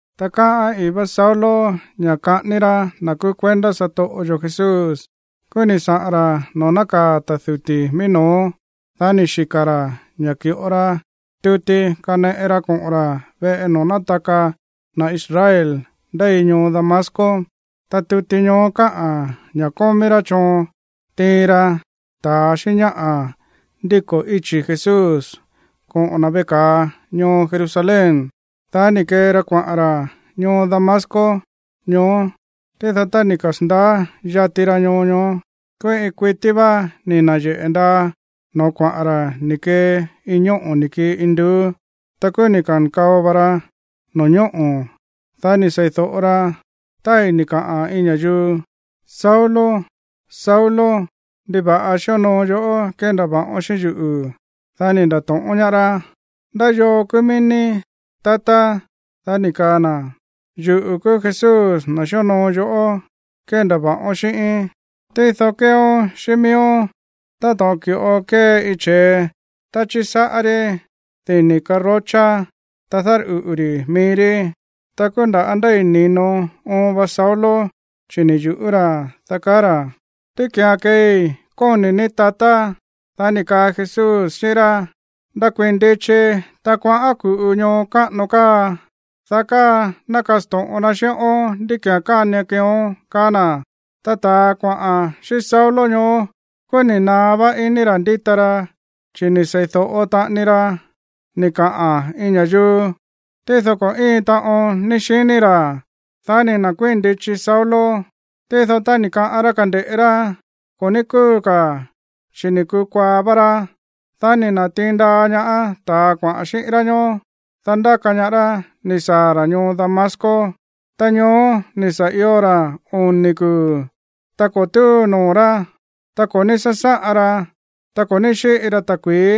Ta káꞌa̱n ii̱ vá Saulo ña̱ kaꞌání rá na̱ kúú kuendá satoꞌo yo̱ Jesús. Kúú ni̱ saꞌa̱n ra̱ noo̱ nákaa̱ ta̱ duti̱ mií no̱ó. Dá ni̱ xika̱ ra̱ ña̱ ki̱ꞌo ra tuti kaneꞌe ra koꞌo̱n ra̱ veꞌe noo̱ nátaka na̱ Israel ndéi ñoo Damasco, ta tuti ñoó káꞌa̱n ña̱ kómí rá choon tiin ra ta̱a xíꞌín ñáꞌa̱ ndíko̱ íchi̱ Jesús koꞌo̱n na̱ veꞌe ka̱a ñoo Jerusalén. Dá ni̱ kee ra kuaꞌa̱n ra̱ ñoo Damasco ñoó. Tído tá ni̱ kasa̱ndaá yati ra ñoo ñoó, kúú iin kuití vá ni̱ na̱yeꞌe̱ ndaa no̱ó kuaꞌa̱n ra̱ ni̱ kee iin ñóꞌo̱ ni̱ kii induú. Ta kúú ni̱ ka̱nkao va ra no̱ñóꞌo̱. Dá ni̱ sei̱do̱ꞌo ra tái̱ ni̱ kaꞌa̱n iin ña̱yuu: ―Saulo, Saulo. ¿Ndiva̱ꞌa xíonoo yoꞌó kéndava̱ꞌón xíꞌín yuꞌu̱? Dá ni̱ nda̱to̱ꞌón ñaá rá: ―¿Ndá yoo kúú mií ní, tatá? Dá ni̱ kaa na̱: ―Yuꞌu̱ kúú Jesús, na̱ xíonoo yoꞌó kéndava̱ꞌa xíꞌón. Tído kéeón xíꞌín miíón táto̱ꞌon ki̱ꞌo kée iin che̱e tá chísáꞌá rí dini̱ karochá, ta dárꞌuꞌu̱ ri̱ mií rí. Ta kúú nda̱ ndéi̱ ni̱no oon va Saulo chi̱ ni̱ yu̱ꞌú ra̱, dá kaá ra̱: ―¿Ndí ki̱án keei kóni̱ ní, tatá? Dá ni̱ kaa Jesús xíꞌín rá: ―Ndakuii̱n ndichi, ta kuaꞌán ku̱ꞌu ñoo káꞌano káa, dá káa ná kasto̱ꞌon na xíꞌón ndí ki̱án kánian keeón ―kaá na̱. Ta ta̱a kuaꞌa̱n xíꞌín Saulo ñoó, kúú ni̱ naá vá iní ra̱ ndíta ra, chi̱ ni̱ sei̱do̱ꞌo taꞌani ra ni̱ kaꞌa̱n iin ña̱yuu, tído ko̱ íin taꞌon ní xiní ra̱. Dá ni̱ nda̱kuíi̱n ndichi Saulo. Tído tá ni̱ kaꞌán rá kande̱ꞌé rá, ko̱ ní kúu ka̱, chi̱ ni̱ kukuaa va ra. Dá ni̱ na̱tiin ndaa ñaá ta̱a kuaꞌa̱n xíꞌín rá ñoó, dá ndáka ñaá rá ni̱ saa̱ ra̱ ñoo Damasco. Ta ñoó ni̱ sa̱ io ra̱ oni̱ kuu̱. Ta ko̱ túu noo̱ rá, ta ko̱ ní sásáꞌan ra, ta ko̱ ní xíꞌi ra ta̱kui̱í.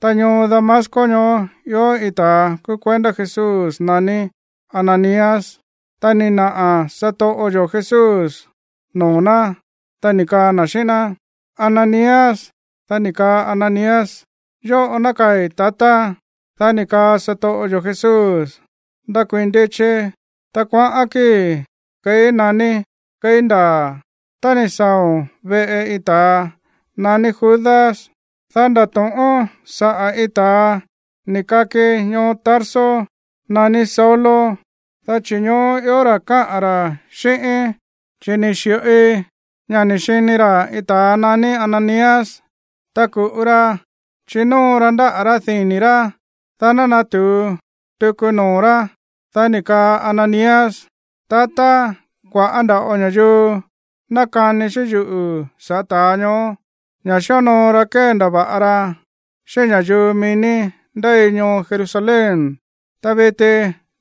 Ta ñoo Damasco ñoó ió iin ta̱a kúú kuendá Jesús naní Ananías. Ta ni̱ naꞌa̱ noo̱ satoꞌo yo̱ Jesús noo̱ ná, ta ni̱ kaa na̱ xíꞌín ná: ―¡Ananías! Dá ni̱ kaa Ananías: ―Yóꞌo nákaa̱i̱, tatá. Dá ni̱ kaa satoꞌo yo̱ Jesús: ―Ndakuii̱n ndichi, ta kuaꞌán kíi̱ keí naní keí Ndaa̱. Tá ni̱ saa̱o̱n veꞌe iin ta̱a naní Judas, dá ndato̱ꞌón saꞌa̱ iin ta̱a ni̱ kaki ñoo Tarso naní Saulo, chi̱ ñoó ió ra̱ káꞌa̱n ra̱ xíꞌíín. Chi̱ ni̱ xi̱ꞌoi ña̱ ni̱ xini ra̱ iin ta̱a naní Ananías, ta ku̱ꞌu ra chinóo ra ndáꞌa̱ rá dini̱ rá, dá ná natu̱u tuku noo̱ rá. Dá ni̱ kaa Ananías: ―Tatá, kua̱ꞌá nda̱ꞌo ña̱yuu nákani xíꞌín yuꞌu̱ sa̱ꞌá ta̱a ñoó, ña̱ xíonoo ra kéndava̱ꞌa ra xíꞌín ña̱yuu mií ní ndéi ñoo Jerusalén. Ta viti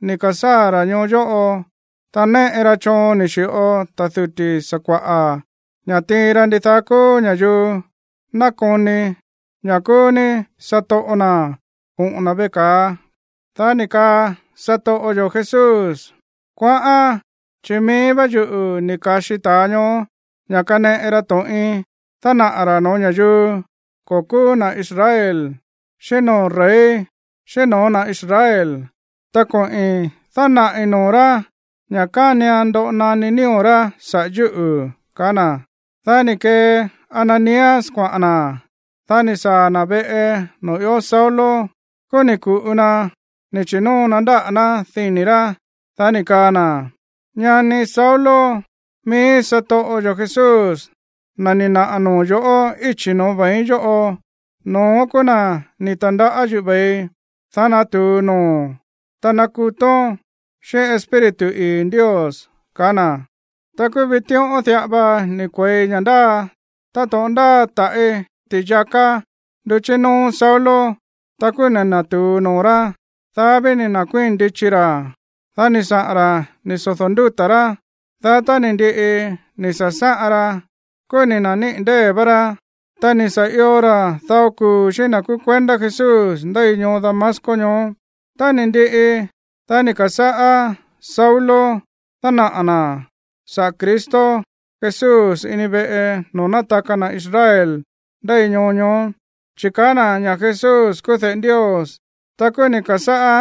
ni̱ ka̱sáa̱ ra̱ ñoo yóꞌo. Ta néꞌe ra choon ni̱ xi̱ꞌo ta̱ duti̱ sakua̱ꞌa̱ ña̱ tiin ra ndidaá kúú ña̱yuu nákoni ña̱ kúú ní satoꞌo na̱ koꞌo̱n na̱ veꞌe ka̱a. Dá ni̱ kaa satoꞌo yo̱ Jesús: ―Kuaꞌán, chi̱ mií vá yuꞌu̱ ni̱ ka̱xi ta̱a ñoó ña̱ kaneꞌe ra to̱ꞌin dánaꞌa̱ ra̱ no̱ó ña̱yuu ko̱ kúú na̱ Israel, xíꞌín noo̱ rey, xíꞌín no̱ó na̱ Israel. Ta koꞌi̱n dánaꞌi̱ noo̱ rá ña̱ kánian ndoꞌo naní nío̱ rá saꞌa̱ yúꞌu̱ ―kaá na̱. Dá ni̱ kee Ananías kuaꞌa̱n na̱. Dá ni̱ saa̱ na̱ veꞌe noo̱ ió Saulo, kúú ni̱ ku̱ꞌu na ni̱ chi̱nóo na ndáꞌa̱ ná dini̱ rá. Dá ni̱ kaa na̱: ―Ñani Saulo, mií satoꞌo yo̱ Jesús, na̱ ni̱ naꞌa̱ noo̱ noo̱ yo̱ꞌó íchi̱ no̱ó ve̱iín yóꞌo, no̱ón kúú na̱ ni̱ ta̱ndaꞌá yuꞌu̱ ve̱ii, dá natu̱u noo̱o̱n, ta nakutón xíꞌín Espíritu ii̱ Ndios ―kaá na̱. Ta kúú vitíꞌón diꞌa va ni̱ kue̱i ña̱ ndáa táto̱ꞌon ndáa taꞌi̱ ti̱yaká nduchí nóó Saulo. Ta kúú ni̱ na̱tu̱u noo̱ rá. Dá ví ni̱ nda̱kuíi̱n ndichi ra̱. Dá ni̱ saꞌa̱n ra̱ ni̱ sodo̱ ndúta̱ rá. Dá tá ni̱ ndiꞌi ni̱ sa̱sáꞌan ra, kúú ni̱ na̱níꞌi̱ ndée̱ vá rá. Ta ni̱ sa̱ io ra̱ dao kuu̱ xíꞌín na̱ kúú kuendá Jesús ndéi ñoo Damasco ñoó. Ta ni̱ ndiꞌi, dá ni̱ ka̱sáꞌá Saulo dánaꞌa̱ na̱ saꞌa̱ Cristo Jesús ini veꞌe noo̱ nátaka na̱ Israel ndéi ñoo ñoó, chi̱ kaá na̱ ña̱ Jesús kúú de̱ꞌe Ndios. Ta kúú ni̱ ka̱sáꞌá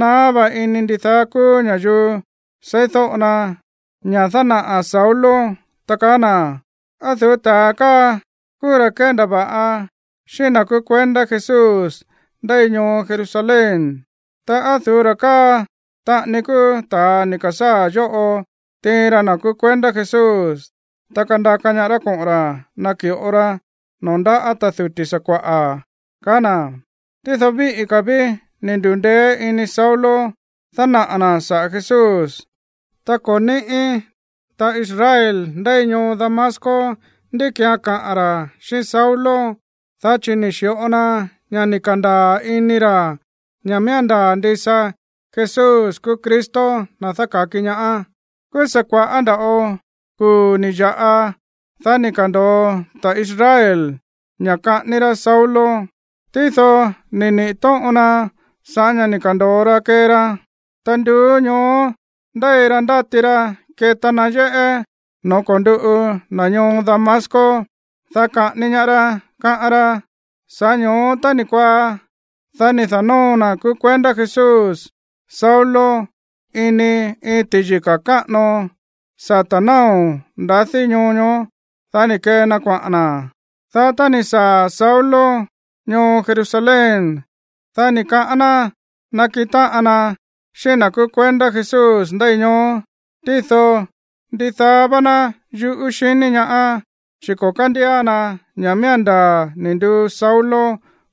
naá vá iní ndidaá kúú ña̱yuu seídóꞌo na ña̱ dánaꞌa̱ Saulo, ta kaá na̱: ―¿Á o̱ du̱ú ta̱a káa kúú ra̱ kéndava̱ꞌa xíꞌín na̱ kúú kuendá Jesús ndéi ñoo Jerusalén? Ta, ¿á o̱ du̱ú ra̱ káa taꞌani kúú ta̱a ni̱ ka̱sáa̱ yóꞌo tiin ra na̱ kúú kuendá Jesús, ta kandaka ñaá rá koꞌo̱n ra̱ naki̱ꞌo ra noo̱ ndáꞌa̱ ta̱ duti̱ sakua̱ꞌa̱? ―kaá na̱. Tído víꞌí ka̱ ví ni̱ ndu̱ndeé iní Saulo dánaꞌa̱ na̱ saꞌa̱ Jesús, ta ko̱ níꞌi̱ ta̱ Israel ndéi ñoo Damasco ndí ki̱án kaꞌa̱n ra̱ xíꞌín Saulo, dá chi̱ ni̱ xi̱ꞌo na ña̱ ni̱ ka̱ndaa̱ ini ra̱ ña̱ miía̱n ndaa̱ ndisa Jesús kúú Cristo, na̱ dáka̱ki ñaá. Kúú sa̱ kua̱ꞌá nda̱ꞌo kuu̱ ni̱ ya̱ꞌa, dá ni̱ ka̱ndo̱o ta̱a Israel ña̱ kaꞌání rá Saulo. Tído ni̱ niꞌi̱ tóꞌon na sa̱ꞌá ña̱ ni̱ ka̱ndo̱o ra kee ra. Ta nduú ñoó ndéi ra ndáti ra keta na yéꞌé noo̱ ko̱nduꞌu na̱ ñoo Damasco, dá kaꞌání ñaá rá, káꞌán rá. Sa̱ꞌá ño̱ó tá ni̱ kuaá, dá ni̱ da̱nóo na̱ kúú kuendá Jesús Saulo ini iin ti̱yika̱ káꞌano sata̱ náo̱ ndadí ñoo ñoó. Dá ni̱ kee na kuaꞌa̱n na̱. Dá tá ni̱ saa̱ Saulo ñoo Jerusalén, dá ni̱ kaꞌán ná nakiꞌin táꞌan na xíꞌín na̱ kúú kuendá Jesús ndéi ñoó. Tído ndidaá vá ná yuꞌú xiní ñaá, chi̱ ko̱ kándía na ña̱ miía̱n ndaa̱ ni̱ nduu Saulo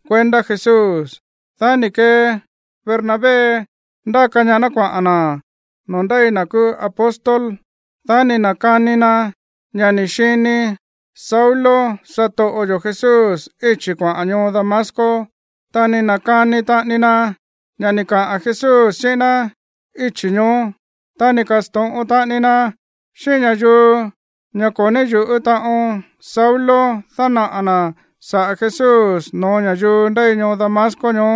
kuendá Jesús. Dá ni̱ kee Bernabé ndáka ñaá ná kuaꞌa̱n na̱ noo̱ ndéi na̱ kúú apóstol. Dá ni̱ na̱kani na ña̱ ni̱ xini Saulo satoꞌo yo̱ Jesús íchi̱ kuaꞌa̱n ñoo Damasco. Ta ni̱ na̱kani taꞌani na ña̱ ni̱ kaꞌa̱n Jesús xíꞌín ná íchi̱ ñoó. Ta ni̱ ka̱sto̱ꞌon taꞌani na xíꞌín ña̱yuu ñoó ña̱ ko̱ ní yu̱ꞌú taꞌon Saulo dánaꞌa̱ na̱ saꞌa̱ Jesús no̱ó ña̱yuu ndéi ñoo Damasco ñoó.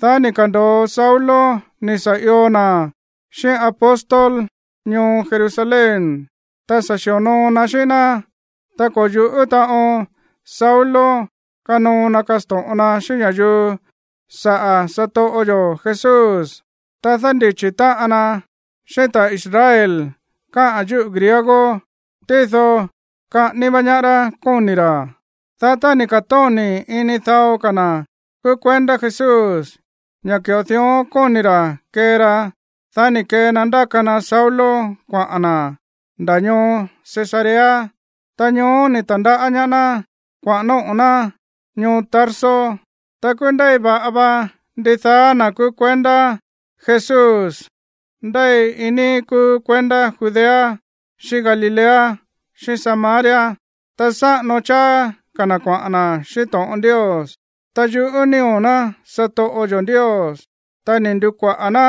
Dá ni̱ ka̱ndo̱o Saulo ni̱ sa̱ io na̱ xíꞌín apóstol ñoo Jerusalén. Ta sa̱ xi̱onoo na xíꞌín ná. Ta ko̱ yu̱ꞌú taꞌon Saulo kanoo na kasto̱ꞌon na xíꞌín ña̱yuu saꞌa̱ satoꞌo yo̱ Jesús. Ta dándichi̱ táꞌan na xíꞌín ta̱ Israel káꞌa̱n yúꞌu̱ griego. Tído kaꞌání vá ñaá rá kóni̱ ra̱. Dá tá ni̱ ka̱tóni̱ ini dao ka̱ na̱ kúú kuendá Jesús ña̱ ki̱ꞌo dión kóni̱ ra̱ kee ra, dá ni̱ kee na ndáka na Saulo kuaꞌa̱n na̱ nda̱ ñoo Cesarea. Ta ñoó ni̱ ta̱ndaꞌá ñaá ná kuaꞌa̱n nóꞌo̱ ná ñoo Tarso. Ta kúú ndéi va̱ꞌa va ndidaá na̱ kúú kuendá Jesús ndéi iin níí kúú kuendá Judea, xíꞌín Galilea, xíꞌín Samaria. Ta sáꞌano cháá ka̱ na̱ kuaꞌa̱n na̱ xíꞌín to̱ꞌon Ndios. Ta yuꞌú nío̱ ná satoꞌo yo̱ Ndios. Ta ni̱ ndu̱kuaꞌa̱ ná,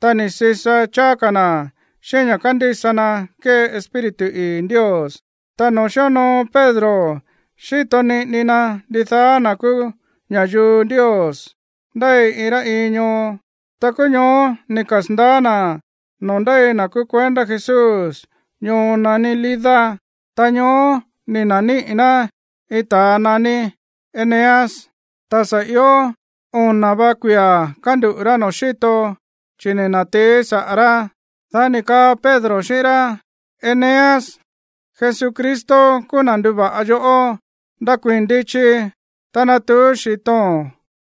ta ni̱ sisa cháá ka̱ na̱ xíꞌín ña̱ kándísa na kée Espíritu ii̱ Ndios. Ta noo̱ xíonoo Pedro xíto niꞌini na ndidaá na̱ kúú ña̱yuu Ndios ndéi iin rá iin ñoo, ta kúú ñoó ni̱ kasa̱ndaá na̱ noo̱ ndéi na̱ kúú kuendá Jesús ñoo naní Lida. Ta ñoó ni̱ na̱níꞌi̱ ná iin ta̱a naní Eneas. Ta sa̱ io ona̱ va kuia̱ kánduꞌu̱ rá noo̱ xíto, chi̱ ni̱ na̱tií saꞌa̱ rá. Dá ni̱ kaa Pedro xíꞌín rá: ―Eneas, Jesucristo kúú na̱ nduva̱ꞌa yoꞌó. Ndakuii̱n ndichi, ta natuú xi̱to̱n.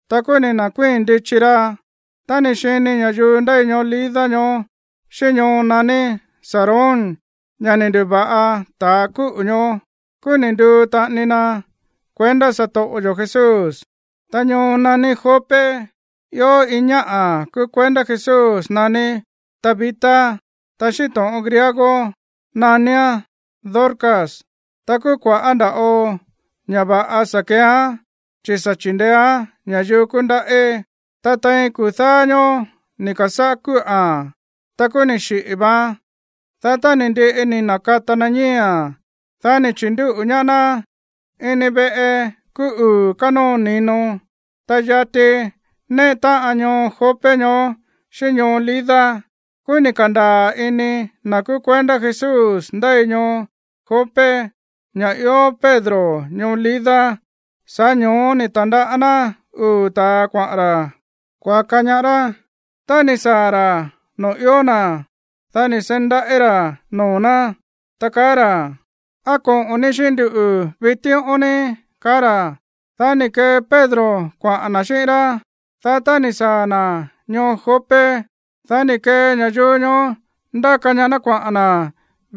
Ta kúú ni̱ na̱kuíi̱n ndichi ra̱. Tá ni̱ xini ña̱yuu ndéi ñoo Lida ñoó xíꞌín ñoo naní Sarón ña̱ ni̱ ndu̱va̱ꞌa ta̱ kúꞌu̱ ñoó, kúú ni̱ nduu taꞌani na kuendá satoꞌo yo̱ Jesús. Ta ñoo naní Jope ió iin ñáꞌa̱ kúú kuendá Jesús naní Tabita. Ta xíꞌín to̱ꞌon griego naníán Dorcas. Ta kúú kua̱ꞌá nda̱ꞌo ña̱ va̱ꞌa sa̱ keeán, chi̱ sa̱ chi̱ndeéán ña̱yuu kúndaꞌí. Ta tein kuu̱ dáá ñóó ni̱ ka̱sáꞌá kúꞌa̱n. Ta kúú ni̱ xiꞌi̱ vaan. Dá tá ni̱ ndiꞌi ni̱ na̱kata na ñíi̱a̱n, dá ni̱ chi̱ndúꞌu̱ ñaá ná ini veꞌe kúú uu̱ kánóo ni̱no. Ta yati néꞌe táꞌan ñoo Jope ñoó xíꞌín ñoo Lida. Kúú ni̱ ka̱ndaa̱ ini na̱ kúú kuendá Jesús ndéi ñoo Jope ña̱ ió Pedro ñoo Lida. Sa̱ꞌá ño̱ó ni̱ ta̱ndaꞌá ná uu̱ ta̱a kuaꞌa̱n ra̱ kuaka ñaá rá. Tá ni̱ saa̱ ra̱ noo̱ ió na̱, dá ni̱ seí ndaꞌí ra̱ noo̱ ná, ta kaá ra̱: ―¿Á koꞌo̱n ní xíꞌín nduꞌu̱ vitíꞌón ní? ―kaá ra̱. Dá ni̱ kee Pedro kuaꞌa̱n na̱ xíꞌín rá. Dá tá ni̱ saa̱ na̱ ñoo Jope, dá ni̱ kee ña̱yuu ñoó ndáka ñaá ná kuaꞌa̱n na̱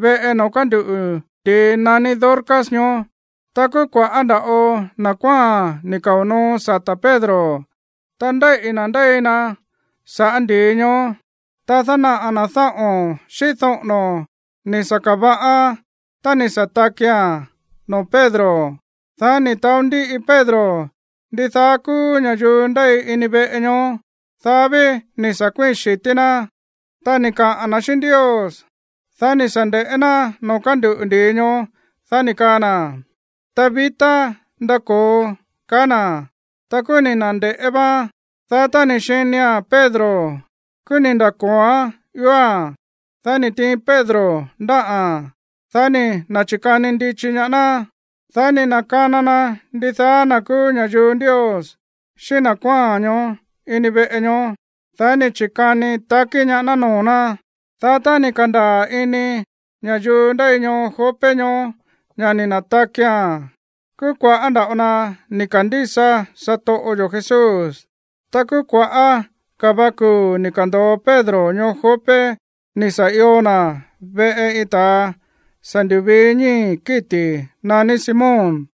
veꞌe noo̱ kánduꞌu̱ ndi̱i naní Dorcas ñoó. Ta kúú kua̱ꞌá nda̱ꞌo na̱ kuáa̱n ni̱ kao̱ noo sata̱ Pedro, ta ndéíꞌi̱ na̱ ndéi na sa̱ꞌá ndi̱i ñoó. Ta dánaꞌa̱ na̱ dáꞌo̱n xíꞌín doꞌo̱no̱ ni̱ sa̱ ka̱va̱ꞌaán tá ni̱ sa̱ takia̱n noo̱ Pedro. Dá ni̱ taó ndíꞌi Pedro ndidaá kúú ña̱yuu ndéi ini veꞌe ñoó. Dá ví ni̱ sa̱ kuíi̱n xi̱tí ná, ta ni̱ kaꞌa̱n na̱ xíꞌín Ndios. Dá ni̱ sa̱ nde̱ꞌé ná noo̱ kánduꞌu̱ ndi̱i ñoó. Dá ni̱ kaa na̱: ―Tabita, ndako̱o ―kaá na̱. Ta kúú ni̱ na̱nde̱ꞌé váán. Dá tá ni̱ xinia̱n Pedro, kúú ni̱ nda̱ko̱oán ióa̱n. Dá ni̱ tiin Pedro ndáꞌa̱n. Dá ni̱ na̱chi̱kani ndichi ñaá ná. Dá ni̱ na̱kana na ndidaá na̱ kúú ña̱yuu Ndios xíꞌín na̱ kuáa̱n ñoó ini veꞌe ñoó. Dá ni̱ chi̱kani takí ñaá ná noo̱ ná. Dá tá ni̱ ka̱ndaa̱ ini ña̱yuu ndéi ñoo Jope ñoó ña̱ ni̱ na̱takia̱n, kúú kua̱ꞌá nda̱ꞌo na ni̱ ka̱ndísa satoꞌo yo̱ Jesús. Ta kúú kua̱ꞌá ka̱ va kuu̱ ni̱ ka̱ndo̱o Pedro ñoo Jope ni̱ sa̱ io na̱ veꞌe iin ta̱a sa̱ ndu̱vii ñíi̱ kíti̱ naní Simón.